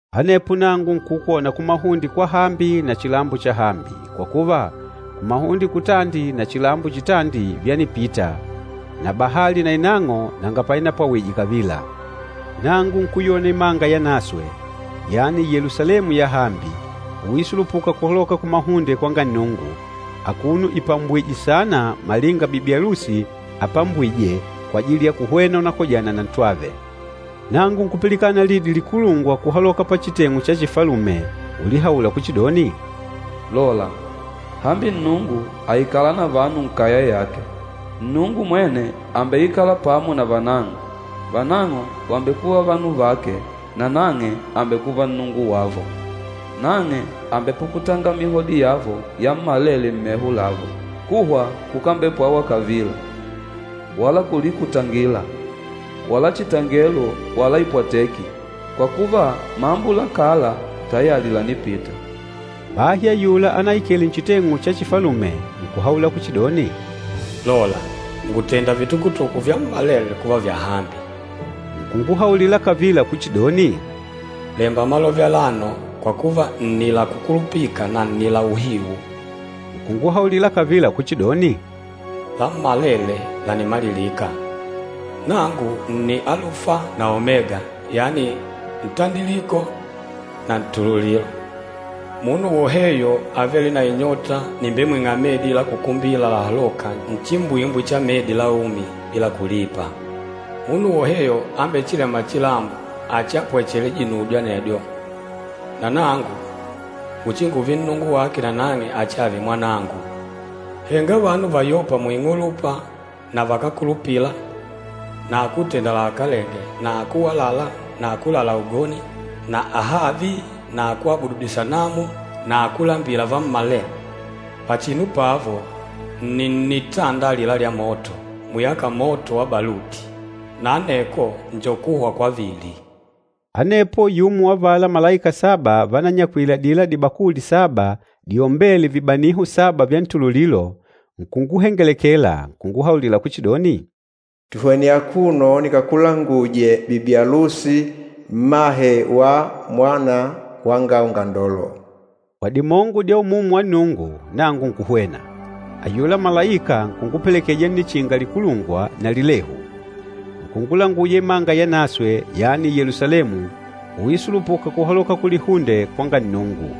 Anepo nangu nkukwona kumahunde kwahambi na chilambo chahambi, kwa kuva, kumahunde kutandi na chilambo chitandi vyanipita, na bahali nainang'o nanga painapwawije kavila. Nangu nkuyona imanga yanaswe, yani Yelusalemu yahambi, uisulupuka kuhaloka kumahunde kwanga Nnungu, akuno ipambwìjwè saana malinga bibi alusi apambwîje kwajili ya kuhwena unakojana na ntwave. Nangu nkupilikana lidi likulungwa kuhaloka pachiteng'u cha chifalume ulihaula kuchidoni, “Lola, hambi Nnungu àikala na vanu nkaya yake! Nnungu mwene àmbeikala pamo na vanang'o. Vanang'o vàmbekuva vanu vake nanang'e àmbekuva Nnungu wavo. Nang'e àmbepukutanga mihodi yavo yammalele mmeho lavo. Kuhwa kukambepwawa kavila, wala kulikutangila wala chitangelo wala ipwateki, kwa kuva, mambo la kala tayali lànipita.” Bahi ayula anaikele nchiteng'u cha chifalume nkuhaula kuchidoni, “Lola, ngùtenda vitukutuku vyammalele kuva vyahambi.” Nkunguhaulila kavila kuchidoni, “Lemba malove alano, kwa kuva, nni la kukulupika na nni la uhiu.” Nkunguhaulila kavila kuchidoni, “Lammalele lànimalilika! Nangu nni Alufa na Omega, yani Ntandiliko na Ntululilo. Munu woheyo avêle na inyota nìmbemwing'a medi la kukumbila lahalôka nchimbwimbwi cha medi la umi, bila kulipa. Munu woheyo ambechilêma chilambo achiapwechele dinudyo anedyo, na nangu nguchinguve Nnungu wake na nang'e achiave mwanangu. Henga vanu vayôpa muing'ulupa na vakákulupila na akútenda lahakalenge na akúwalala na akúlala ugoni na ahavi na akúabudu disanamu na akúlambila vammalele, pachinu pavo nni nnitanda alila lya moto, muyâka moto wa baluti. Na anekwo njo kuhwa kwavili.” Anepo yumo wa avala malaika saba vananyakwile adila dibakuli saba diombêle vibaniho saba vya ntululilo, nkunguhengelekela, nkunguhaulila kuchidoni, “Tuhwene akuno nikakulanguje bibi alusi, mmahe wa Mwana wanga Ungandolo.” Kwa dimongo dya Umumu wa Nnungu nangu nkuhwena, ayula malaika nkungupelekeja nnichinga likulungwa na lilehu. Nkungulanguja imanga yanaswe, yani Yelusalemu, uisulupuka kuhaloka kulihunde kwanga Nnungu.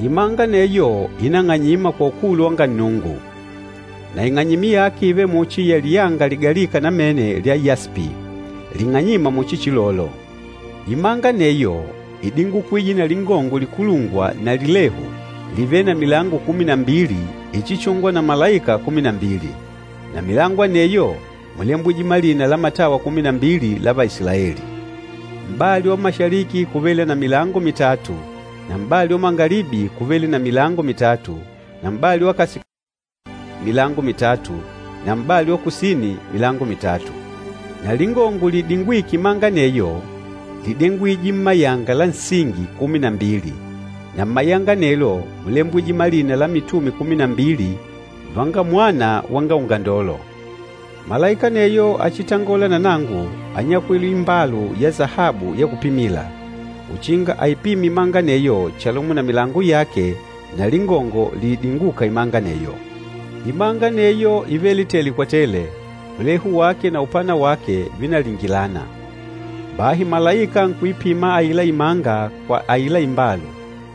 Imanga aneyo ínang'anyima kwa ukulu wanga Nnungu. Na ing'anyimi yake ívele muchi ya liyanga ligalîka namene lya yaspi, ling'anyîma muchi chilolo. Imanga aneyo ídingukwije na lingongo likulungwa na lilehu livêle na milango kumi na mbili ichichûngwa na malaika kumi na mbili. Na mmilango aneyo múlembwije malina la matawa kumi na mbili la Vaisilaeli. Mpata wa kumanga kúvele na milango mitatu na m'bali wa kundonde kúvele na milango mitatu na m'bali wa kasikasini milango mitatu na m'bali wa kusini milango mitatu. Na lingongo liidingwîke imanga aneyo lídengwije mmayanga la nsingi kumi na mbili, na mmayanga anelo múlembwije malina la mitume kumi na mbili vanga Mwana wanga Ungandolo. Malaika aneyo achitangôla na nangu ányakwile imbalu ya sahabu ya kupimila, uchinga aipime imanga aneyo chalumo na milango yake na lingongo liidingûka imanga aneyo. Imanga aneyo ívele tele kwa tele, ulehu wake na upana wake vínalingilana. Bahi malaika nkuipima aila imanga kwa aila imbalu,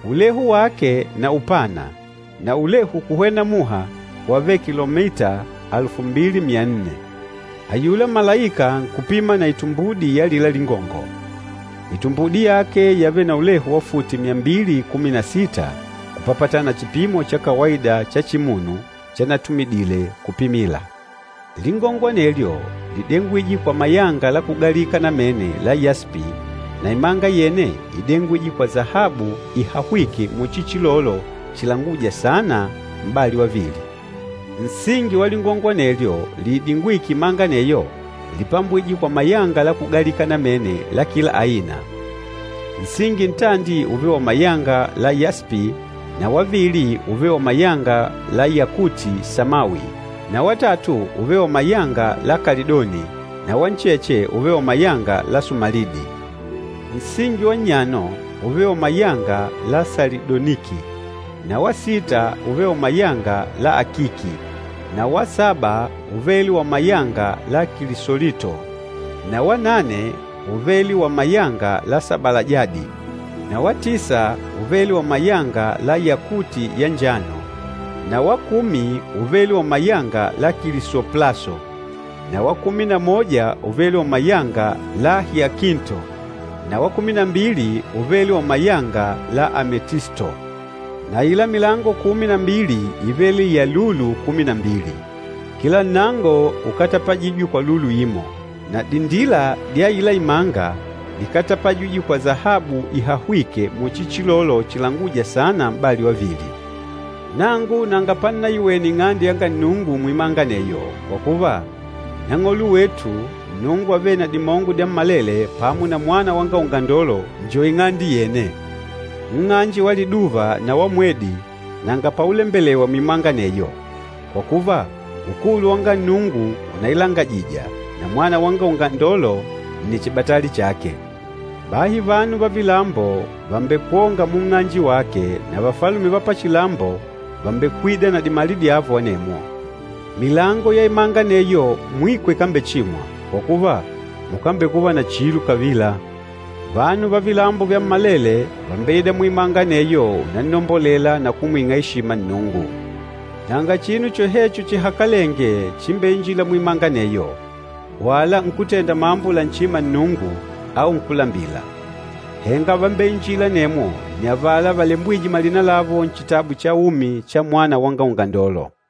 ulehu wake na upana na ulehu kuhwena muha wávele kilomita alufu mbili myanne. Ayula malaika nkupima na itumbudi ya alila lingongo, itumbudi yake yávele na ulehu wa futi myambili kumi na sita kupapatana na chipimo cha kawaida cha chimunu chanatumidile kupimila. Lingongo anelyo lídengwije kwa mayanga la kugalika namene la yaspi, na imanga yene ídengwije kwa sahabu ihahwîke muchi chilolo chilangûja saana m'bali wavili. Nsingi wa lingongo anelyo liidingwîke imanga aneyo lípambwije kwa mayanga la kugalika namene la kila aina. Nsingi ntandi úvele wa mayanga la yaspi na wavili úvele wa mayanga la yakuti samawi na watatu úvele wa mayanga la kalidoni na wa ncheche úvele wa mayanga la sumalidi. Nsingi wa nnyano úvele wa mayanga la salidoniki na wa sita úvele wa mayanga la akiki na wa saba úvele wa mayanga la kilisolito na wanane úvele wa mayanga la sabalajadi na wa tisa úvele wa mayanga la yakuti ya njano na wa kumi úvele wa mayanga la kilisoplaso na wa kumi na moja úvele wa mayanga la hiakinto na wa kumi na mbili úvele wa mayanga la ametisto. Na aila milango kumi na mbili ívele ya lulu kumi na mbili. Kila nnango úkatapajijwe kwa lulu imo. Na dindila dya aila imanga díkatapajijwe kwa sahabu ihahwîke muchi chilolo chilangûja saana m'bali wavili. Nangu nanga pannaiwene Ing'ande yanga Nnungu muimanga aneyo, kwa kuva, Nang'olo wetu, Nnungu Avêle na Dimongo Dyammalele pamo na Mwana wanga Ungandolo njo ing'ande yene. Nng'anje wa liduva na wa mwedi nanga paulembelewa muimanga aneyo, kwa kuva, ukulu wanga Nnungu unailangajija, na Mwana wanga Ungandolo nni chibatali chake. Bahi vanu va vilambo vàmbekwonga munng'anje wake na vafalume va pachilambo vàmbekwida na dimali dyavo anemwo. Milango ya imanga aneyo mwiko ikambechimwa, kwa kuva, mukambekuva na chilo kavila. Vanu va vilambo vyammalele vàmbeida muimanga aneyo unannombolela na kumwing'a eshima Nnungu. Nanga chinu chohecho chihakalenge chimbeinjîla muimanga aneyo, wala nkútenda mambo lanchîma Nnungu au nkúlambila. Henga vambeinjîla anemwo nni avala valembwîje malina lavo Nchitabu cha Umi cha Mwana wanga Ungandolo.